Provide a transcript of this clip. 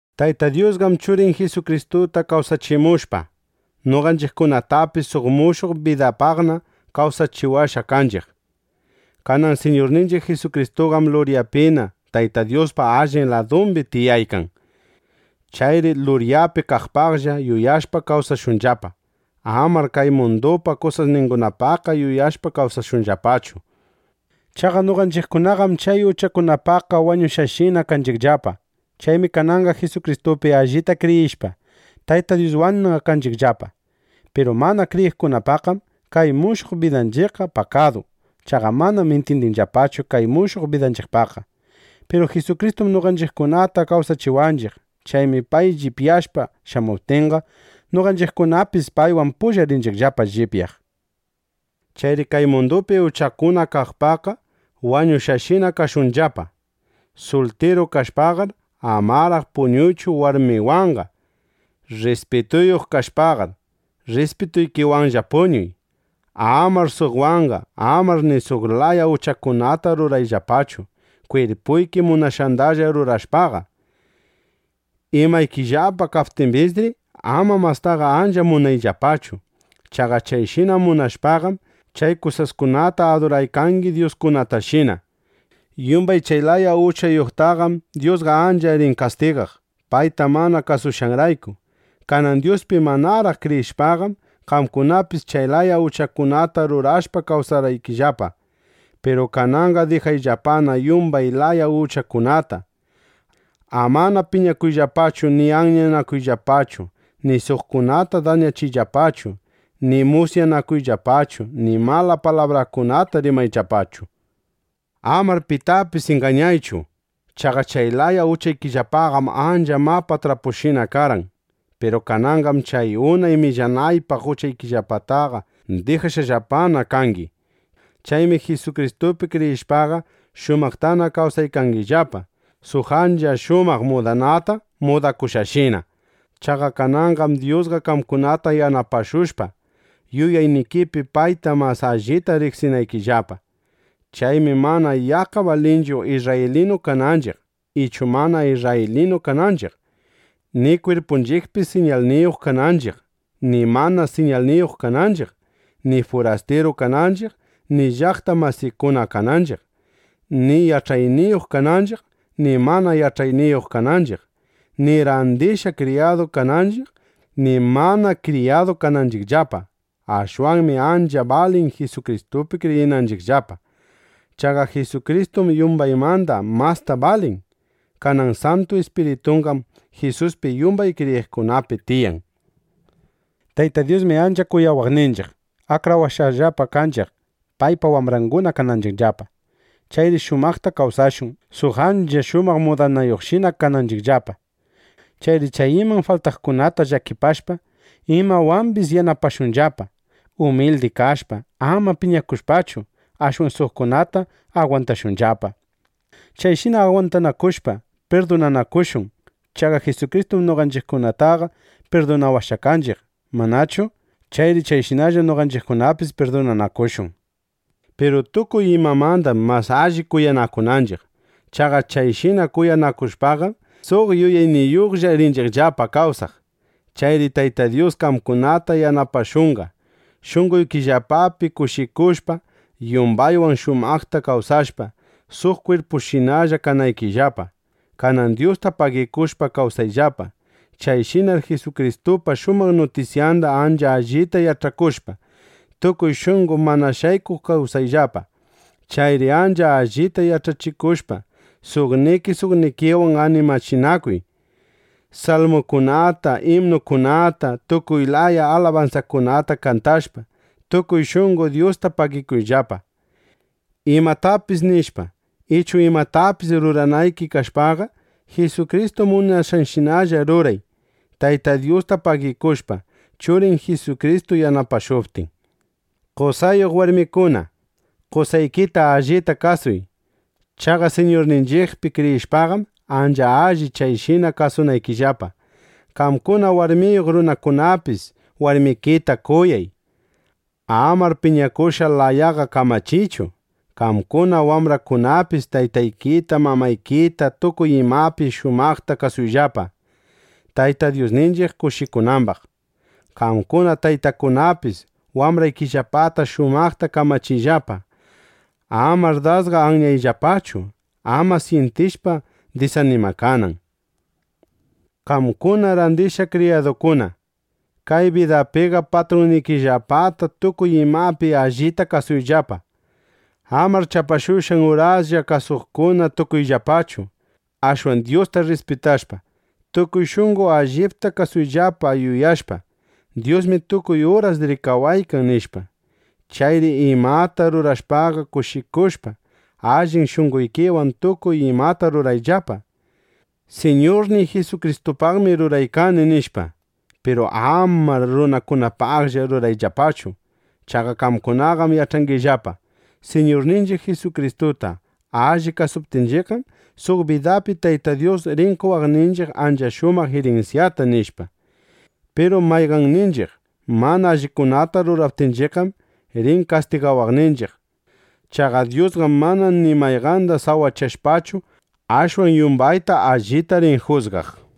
Tayta Dyusqam Churin Jisukristuta kawsachimushpa, noqanchiqkunatapis suq mushuq bidapaqna kawsachiwashqa kanchiq. Kanan Siñurninchiq Jisukristuqam luryapina Tayta Dyuspa allin ladumbi tiyaykan. Chayri luryapi kaqpaqlla yuyashpa kawsashunllapa. Amanar kay mundupa kusasningunapaqqa yuyashpa kawsashunllapachu. Chaqa noqanchiqkunaqam chay uchakunapaqqa wañushqashinana kanchiqllapa. Chaymi kananqa Jisukristupi allita kriyishpa, Tayta Dyuswanna kanchiqllapa. Piru mana kriyiqkunapaqqam kay mushuq bidanchiqqa pakadu. (Chaqa manam intyindinllapachu kay mushuq bidanchiqpaqqa.) Piru Jisukristum noqanchiqkunata kawsachiwanchiq. Chaymi pay llipyashpa shamuptinqa, noqanchiqkunapis paywan pulla rinchiqllapa llipyaq. Chayri kay mundupi uchakuna kaqpaqqa wañushqashina kashunllapa. Sultiru kashpaqar, amaraq puñuychu warmiwanqa. Rrispituyuq kashpaqar, rrispituykiwanlla puñuy. Amar suqwanqa. Amar ni suq laya uchakunata rurayllapachu, kwirpuyki munashqandalla rurashpaqa. Imaykillapa kaptimbisri, ama mastaqa ancha munayllapachu. Chaqa chayshina munashpaqam, chay kusaskunata aduraykangi dyuskunatashina. Yumbay chay laya uchayuqtaqam Dyusqa ancha rin kastigaq, payta mana kasushqanrayku. Kanan Dyuspi manaraq kriyishpaqam, qamkunapis chay laya uchakunata rurashpa kawsarqaykillapa. Piru kananqa dijayllapana yumbay laya uchakunata. Amana piñakuyllapachu ni anyanakuyllapachu ni suqkunata dañachiyllapachu ni musyakuyllapachu ni mala palabrakunata rimayllapachu. Amar pitapis ingañaychu. Chaqa chay laya uchaykillapaqam ancha mapa trapushina karqan. Piru kananqam chay unay millanaypaq uchaykillapataqa dijashqallapana kangi. Chaymi Jisukristupi kriyishpaqa, shumaqtana kawsaykangillapa, suq ancha shumaq mudanata mudakushqashina. Chaqa kananqam Dyusqa qamkunata yanapashushqa, yuyaynikipi payta mas allita riqsinaykillapa. Chaymi mana yaqqa balinchu isrraylinu kananchiq ichu mana isrraylinu kananchiq, ni kwirpunchiqpi siñalniyuq kananchiq ni mana siñalniyuq kananchiq, ni furastiru kananchiq ni llaqta masikuna kananchiq, ni yach'ayniyuq kananchiq ni mana yach'ayniyuq kananchiq, ni randishqa kriyadu kananchiq ni mana kriyadu kananchiqllapa. Ashwanmi ancha balin Jisukristupi kriyinanchiqllapa. Chaqa Jisukristum yumbaymanda masta balin. Kanan Santu Ispiritunqam Jisuspi yumbay kriyiqkunapi tiyan. Tayta Dyusmi ancha kuyawaqninchiq, akrawashqallapa kanchiq, paypa wambranguna kananchiqllapa. Chayri shumaqta kawsashun, suq ancha shumaq mudanayuqshina kananchiqllapa. Chayri chay iman faltaqkunata llakipashpa, imawambis yanapashunllapa. Umildi kashpa, ama piñakushpachu, ashwan suqkunata agwantashunllapa. Chayshina agwantanakushpa, pirdunanakushun. Chaqa Jisukristum noqanchiqkunataqa pirdunawashqa kanchiq, ¿manachu? Chayri chayshinalla noqanchiqkunapis pirdunanakushun. Piru tukuy imamandam mas alli kuyanakunanchiq. Chaqa chayshina kuyanakushpaqam, suq yuyayniyuqlla rinchiqllapa kawsaq. Chayri Tayta Dyus qamkunata yanapashunqa, shunqoykillapapi kushikushpa, yumbaywan shumaqta kawsashpa, suq kwirpushinalla kanaykillapa. Kanan Dyusta pagikushpa kawsayllapa. Chayshinar Jisukristupa shumaq nutisyanda ancha allita yach'akushpa, tukuy shunqo mana shaykuq kasuyllapa. Chayri ancha allita yach'achinakushpa suqniki suqnikiwan animachinakuy. Salmukunata, imnukunata, tukuy laya alabansakunata kantashpa, tukuy shunqo Dyusta pagikuyllapa. Imatapis nishpa, ichu imatapis ruranayki kashpaqa, Jisukristu munashqanshinalla ruray, Tayta Dyusta pagikushpa, Churin Jisukristu yanapashuptin. Qosayuq warmikuna, qosaykita allita kasuy. Chaqa Siñurninchiqpi kriyishpaqam, ancha alli chayshina kasunaykillapa. Qamkuna warmiyuq runakunapis warmikita kuyay. Amar piñakushqa layaqa kamachiychu. Qamkuna wambrakunapis, taytaykita, mamaykita tukuy imapi shumaqta kasuyllapa, Tayta Dyusninchiq kushikunambaq. Qamkuna taytakunapis, wambraykillapata shumaqta kamachiyllapa. Amar dasqa anyayllapachu, ama syintishpa disanimakanan. Qamkuna randishqa kriyadukuna, kay bidapiqa patrunnikillapata tukuy imapi allita kasuyllapa. Amar chapashushqan uraslla kasuqkuna tukuyllapachu. Ashwan Dyusta rrispitashpa, tukuy shunqo allipta kasuyllapa yuyashpa: Dyusmi tukuy uras rikawaykan, nishpa. Chayri imata rurashpaqa kushikushpa, allin shunqoykiwan tukuy imata rurayllapa: Siñurniy Jisukristupaqmi ruraykani, nishpa. Piru amar runakunapaqllaqa rurayllapachu. Chaqa qamkunaqam yach'angillapa: Siñurninchiq Jisukristuta allita kasuptinchiqqam, suq bidapi Tayta Dyus rin qowaqninchiq ancha shumaq irinsyata, nishpa. Piru mayqanninchiq mana allikunata ruraptinchiqqam, rin kastigawaqninchiq. Chaqa Dyusqam mana ni mayqanda sawachashpachu, ashwan yumbayta allita rin jusgaq.